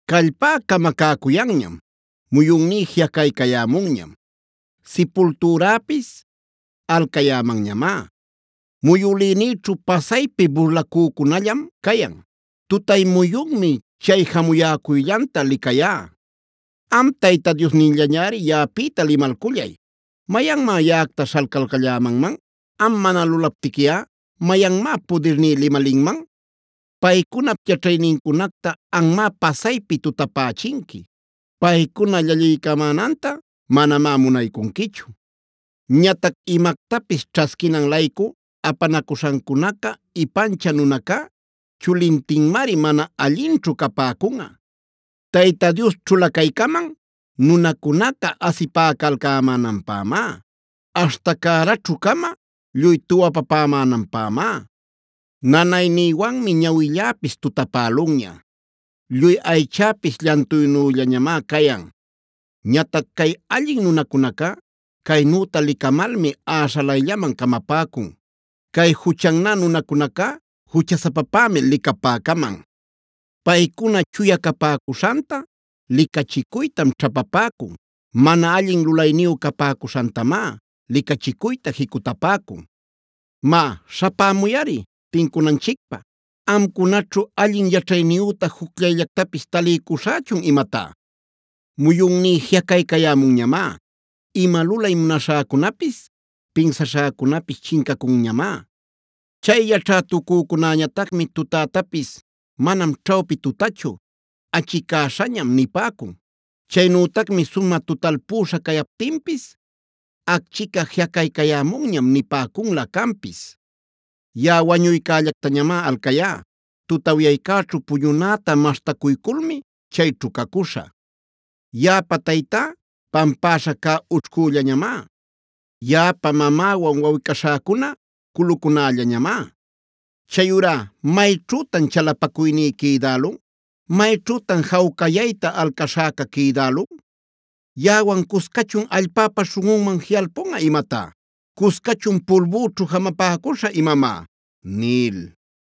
“Callpá camacäcuyanñam, muyunní jiꞌacaycayämunñam, sipultüräpis alcayämanñamá. Muyülïnïćhu pasaypi burlacücunallam cayan. Tutay muyunmi chay jamuyäcuyllanta licayá. “Am Tayta Diosnilläñari yaꞌapïta limalcullay. ¿Mayanmá yaꞌacta śhalcalcallämanman? Am mana lulaptiquiꞌa ¿mayanmá pudirní limalinman? Paycunap yaćhaynincunacta anmá pasaypi tutapächinqui. Paycuna llalliycamänanta manamá munaycunquichu. Ñatac imactapis ćhasquinan-laycu apanacuśhancunacta ipanchä nunacá, chulintinmari mana allinćhu capäcunꞌa. “Tayta Dios ćhulacaycaman nunacunaca asipäcalcämänanpämá, aśhta cäraćhu-cama lluy tuwapapämänanpämá. Nanaynïwanmi ñawilläpis tutapälunña, lluy aychäpis llantuynüllañamá cayan. Ñatac cay allin nunacunacá caynüta licamalmi äśhalayllaman camapäcun. Cay juchannä nunacunacá juchasapapämi licapäcaman. Paycuna chuya capäcuśhanta licachicuytam ćhapapäcun; mana allin lulayniyu capäcuśhantamá licachicuyta jicutapäcun. “Má, śhapämuyꞌari tincunanchicpä. ¿Amcunaćhu allin yaćhayniyüta jucllayllactapis taliycuśhächun imatá? Muyunní jiꞌacaycayämunñamá, ima lulay munaśhäcunapis, pinsaśhäcunapis chincacunñamá. Chay yaćhätucücunäñatacmi tutätapis: ‘Manam ćhawpi tutachu, achicäśhañam’ nipäcun. Chaynütacmi sumä tutalpüśha cayaptinpis: ‘Acchica jiꞌacaycayämunñam’ nipäcunlä canpis. Yaꞌa wañuycällactañamá alcayá; tutawyaycäćhu puñunäta maśhtacuyculmi chayćhu cacuśhä. Yaꞌapa taytá pampäśha cä ućhcüllañamá. Yaꞌapa mamäwan wawꞌi-caśhäcuna culucunällañamá. Chayurá ¿mayćhütan chalapacuyní quïdälun? ¿Mayćhütan jawcayayta alcaśhäca quïdälun? ¿Yaꞌawan cuscachun allpäpa śhunꞌunman jiꞌacalpunꞌa imatá? ¿Cuscachun pulbüćhu jamapäcuśhä imamá?” nil.